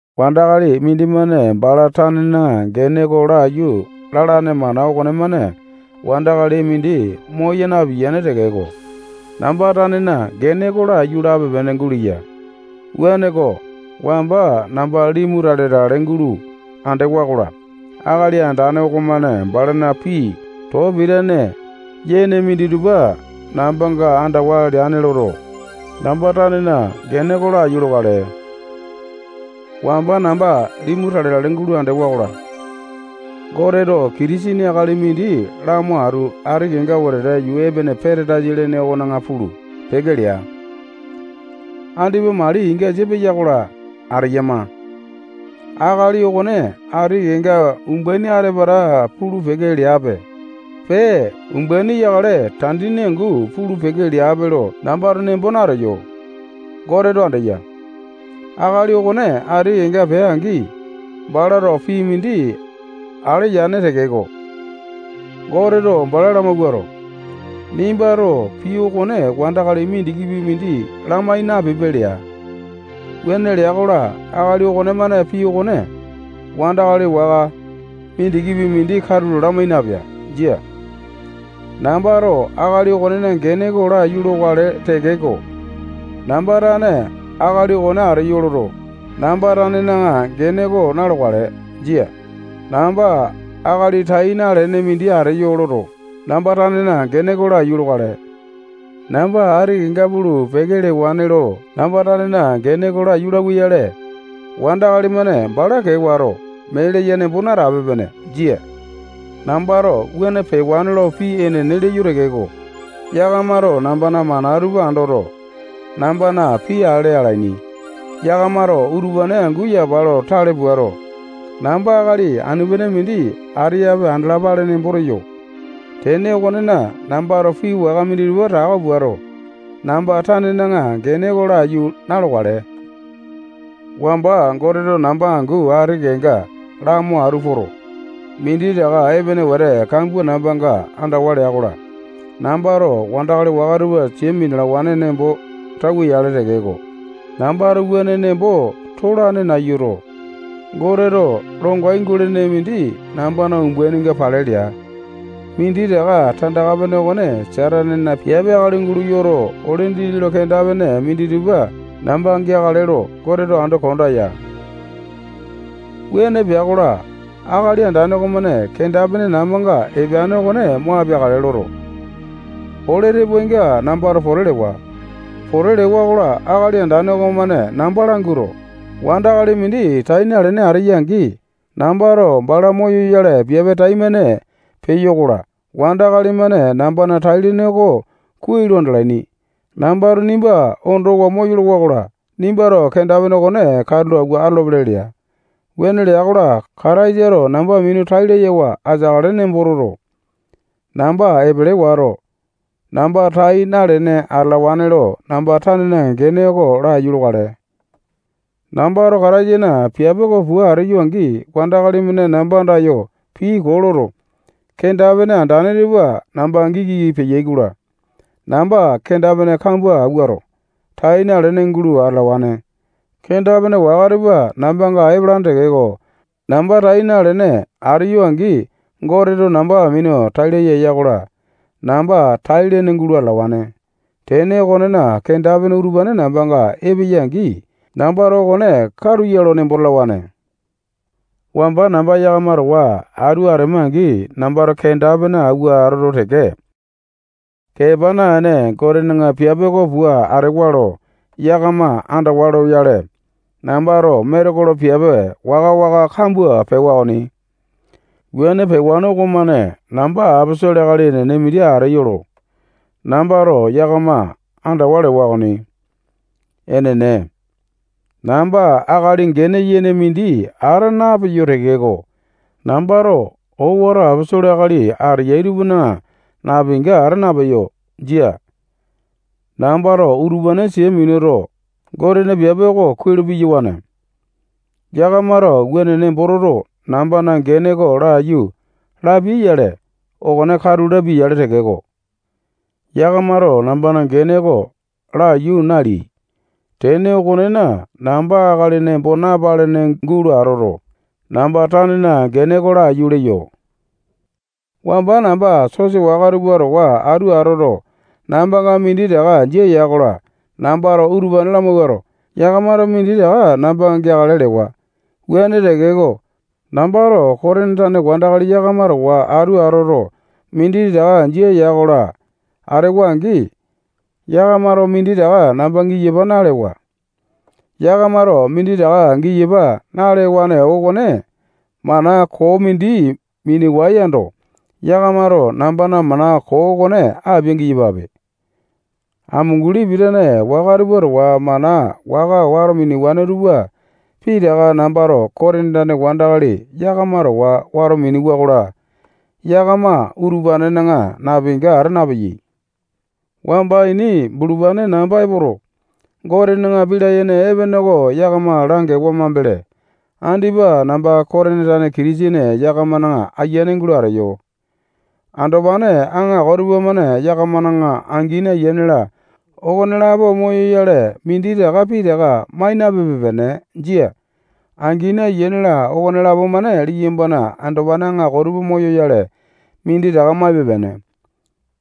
Wandakali mindimane bala tanena gene oko laiyu lalane mana okonemane wandakali mindi moya napiyane tekeko, namba tanena gene oko laiyu lape-pene guleya. Wuaneko, wamba namba limu tale-tale gulo andewa-kola, Akali Andane okomane balana pii too pitane yene minditupa nambanga andawa leane loto, namba tanena gene oko laiyu lokale. Wamba namba limu tale-tale gulo andewa-kola, Goteto Kitisene akali mindi lamo atu ati kenga wetete yuu epene Patandaisa lene okona pulu, peke lea. Andipa mali ingasa peya-kola, ateyama. Akali okone ati kenga umbaini ata-pata pulu-peke leape, pee, umbaini yakale, tandini angu pulu-peke leape lo nambato nembo nateyo. Goteto andeya. Akali okone ati kenga pea-angi, balato pii mindi ale yane tekeko, Goteto bala lamawuato, nimbato pii okone wandakali mindikipi mindi lamai napipe lea. Wuane lea-kola, akali okonemane pii okone wandakali waka mindikipi mindi katulo lamai napea. Jia. Nambato akali okonena gene oko laiyu lokale tekeko, namba tane akali okone ateyo loto, namba tanena gene oko na-lokale. Jia. Namba akali tai nalene mindi ateyo loto, namba tanena gene oko laiyu lokale. Namba ati kenga pulu, peke lewane lo namba tanena gene oko laiyu lauwa-yale, wandakali-mane bala kee wato, mee leya nembo natape-pene. Jia. Nambato wuane pewane lo pii enene leyo tekeko, yakamato nambana mana tupa andoto, nambana pii ale alaini. Yakamato utupane angu yapa lo tale puato, namba akali anu-pene mindi ateyape andalapale nembo teyo. Tene okonena, nambato pii waka minditupa tako puato, namba tanena gene oko laiyu na-lokale. Wamba Goteto namba angu ati kenga lamo atu poto, minditaka epene wete kambua nambanga andawa lea-kola, nambato wandakali waka tupa sia minalawane nembo tauwa-yale tekeko, nambato wuane nembo tolane nayuto, Goteto longai gulene mindi nambana umbaininga pale lea. Minditaka tandaka-pene okone Satanena piape akali gulo yoto, ole dindi lo kenda-pene minditupa namba geakale lo Goteto ando konda ya. Wuane pea-kola, Akali Andane okomane kenda-pene nambanga epeane okone mo apeakale loto, ole tepoainga nambato pote lewa. Pote lewa-kola, Akali Andane okomane namba languato, wandakali mindi tai nalene ateya-angi, nambato bala moyoyale piape taimane peyo-kola, wandakali-mane nambana tai-lene oko kuai lo andalaini. Nambato nimba ondowa moyolowa-kola, nimbato kenda-pene okone katulo awua atolopele lea. Wuane lea-kola, Kataisato namba minu tai layawa ateakale nembo toto, namba epele wato, namba tai nalene atalawane lo namba tanena gene oko laiyu lokale. Nambato Kataisana piape oko pua ateyo-angi, wandakali-mane namba andayo pii koo loto, kenda-pene andane tupa namba giki peyai-kola, namba kenda-pene kambua awuato, tai nalene gulo atalawane. Kenda-pene waka tupa nambanga epalane tekeko, namba tai nalene ateyo-angi, Goteto namba minu tai laya eya-kola namba tai-lene gulo atalawane. Tene okonena, kenda-pene utupane nambanga epeyai-angi, nambato okone katu ya lo nembo talawane. Wamba namba yakama towa atu atema-angi, nambato kenda-pene awua atoto teke, kepa naene, Gotena piape oko pua atewa lo yakama andawa loyale, nambato metekolo piape waka-waka kambua pewa okoni. Wuane pewane okomane, namba aposolo akali enene mindi ateyo lo nambato yakama andawa lewa okoni. Enene, namba akali gene yene mindi ata napeyo tekeko, nambato owato aposolo akali ateyai tupana napinga ata napeyo. Jia. Nambato utupane sia minuto, Gotena piape oko kuai lo piyawane. Yakamato wuane nembo toto, nambana gene oko laiyu lapiai-yale, okone katu lapia-yale tekeko, yakamato nambana gene oko laiyu naleai. Tene okonena, namba akali nembo napalene gulo atoto, namba tanena gene oko laiyu leyo. Wamba namba sosa waka tupa towa atu atoto, nambanga minditaka jia ya-kola, nambato utupane lamawuato, yakamato minditaka namba geakale lewa. Wuane tekeko, nambato Kotini tane wandakali yakama towa atu atoto, minditaka jia ya-kola, atewa-angi, yakamato minditaka namba giyapa nalewa. Yakamato minditaka giyapa nalewa okone mana koo mindi miniwae yando, yakamato nambana mana koo okone apia-giyapape. Amunguli pitane waka tupa towa mana waka wato minewane tupa pitaka nambato Kotini tane wandakali yakama towa wato minewa-kola, yakama utupanena napinga ata napeyai. Wamba ini bulupane namba epoto, Gotena pii layene epene oko yakama langewa mambele, andipa namba Kotini tane Kitisene yakamana ayiane gulo ateyo. Andopane aŋako tupamane yakamana angini, ayiane-la, okonelapo moyoyale, minditaka pitaka mai napepe-pene. Jia. Angini, ayiane-la, okonelapo-mane liyambana andopane aŋako tupa moyoyale, minditaka maipe-pene.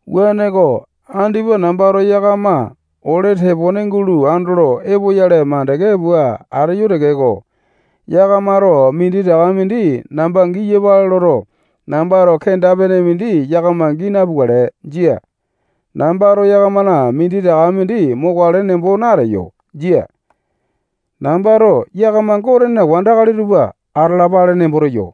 Wuaneko, andipa nambato yakama ole tepone gulo andolo epoyale mandeke pua ateyo tekeko, yakamato minditaka mindi namba giyapale loto, nambato kenda-pene mindi yakama gii napukale. Jia. Nambato yakamana minditaka mindi mokale nembo nateyo. Jia. Nambato yakama Gotena wandakali tupa atalapale nembo teyo.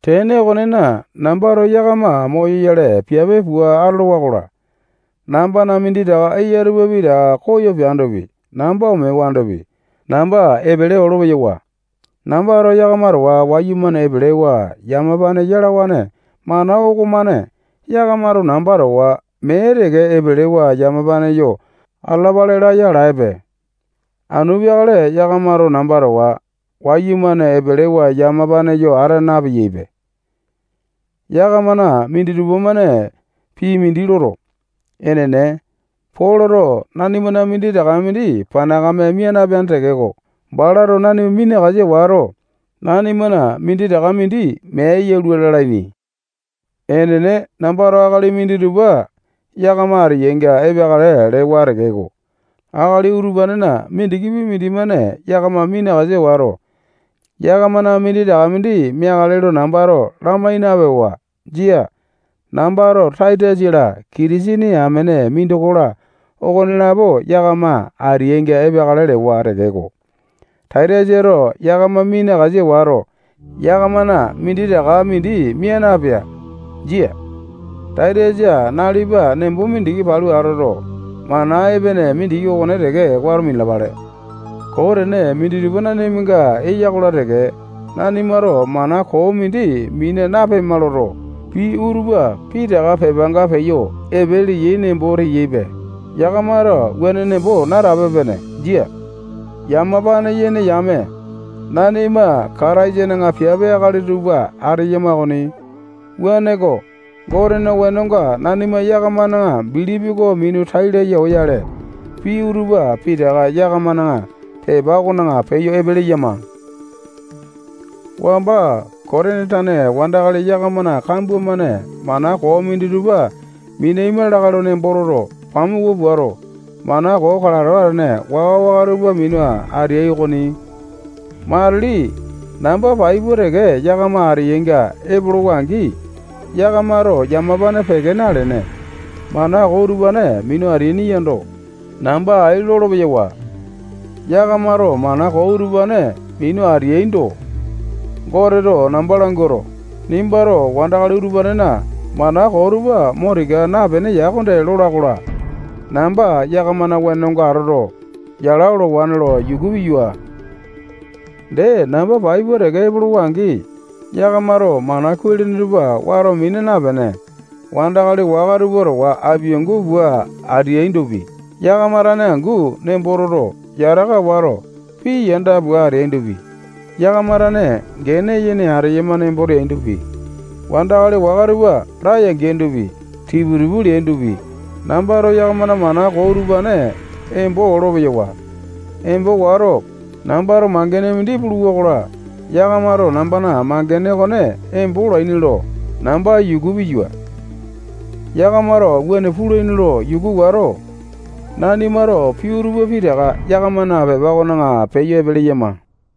Tene okonena, nambato yakama moyoyale piape pua atolowa-kola, nambana minditaka eya tupa pitaka koyo peandopi, namba omewandopi, namba epele olo-peyawa. Nambato yakama towa wayumane epelewa yamapane yalawane mana okomane yakamato namba towa mee teke epelewa yamapane yo atalapale laya alaepe. Anu peakale yakamato namba towa wayumane epelewa yamapane yo ata napeyaipe. Yakamana minditupa-mane pii mindi loto, enene, Poloto nanimana minditaka mindi panakame mia napeane tekeko, balato nanima minakasa wato, nanimana minditaka mindi mea yalua lalaini. Enene, nambato akali minditupa yakama ateainga epeakale lewa tekeko, akali utupanena mindikipi mindimane yakama minakasa wato, yakamana minditaka mindi meakale lo nambato lamai napewa. Jia. Nambato Taitasa-la, Kitisene amene mindoko-la, okonelapo yakama ateainga epeakale lewa tekeko, Taitasato yakama minakasa wato, yakamana minditaka mindi mia napea. Jia. Taitasa, nalipa nembo mindiki palu atoto, mana epene mindiki okone teke wato minalapale. Koo tene minditupa nanimanga eya-kola teke, nanimato mana koo mindi mina napema loto, pii utupa pitaka pepanga peyo epe leyai nembo teyaipe. Yakamato wuane nembo natape-pene. Jia. Yamapane yene yame, nanima Kataisana piape akali tupa ateyama okoni. Wuaneko, Gotena wenonga, nanima yakamana bilipi oko minu tai laya oyale, pii utupa pitaka yakamana pepa okona peyo epe leyama. Wamba Kotini tane wandakali yakamana kambua-mane mana koo minditupa minaima lakae lo nembo toto, pamuku puato, mana koo kalato atene waka-waka tupa minu ateai okoni. Matili namba pai pua teke yakama ateyainga epolowa-angi, yakamato yamapane peke nalene, mana koo utupane minu ateaini yando, namba ai lolo-peyawa. Yakamato mana koo utupane minu ateaindo, Goteto namba languato, nimbato wandakali utupanena mana koo tupa mo tika napeene ya okonde lola-kola, namba yakamana wenonga atoto, yala olowane lo yuku piyua. Dee, namba pai pua teke epolowa-angi, yakamato mana kuai-lene tupa wato mina napene, wandakali waka tupa towa apiangu pua ateaindopi, yakama tane angu nembo toto, yataka wato, pii yanda pua ateaindopi, yakama tane gene yene ateyama nembo teaindopi, wandakali waka tupa laya-geaindopi, tipu-tipu leaindopi, nambato yakamana mana koo utupane embo olo-peyawa. Embo wato, nambato mangene mindi puluwa-kola, yakamato nambana mangene okone embo olaini lo namba yuku piyua. Yakamato wuane pulaini lo yuku wato, nanimato pii utupa pitaka yakamana pepa okona peyo epe leyama.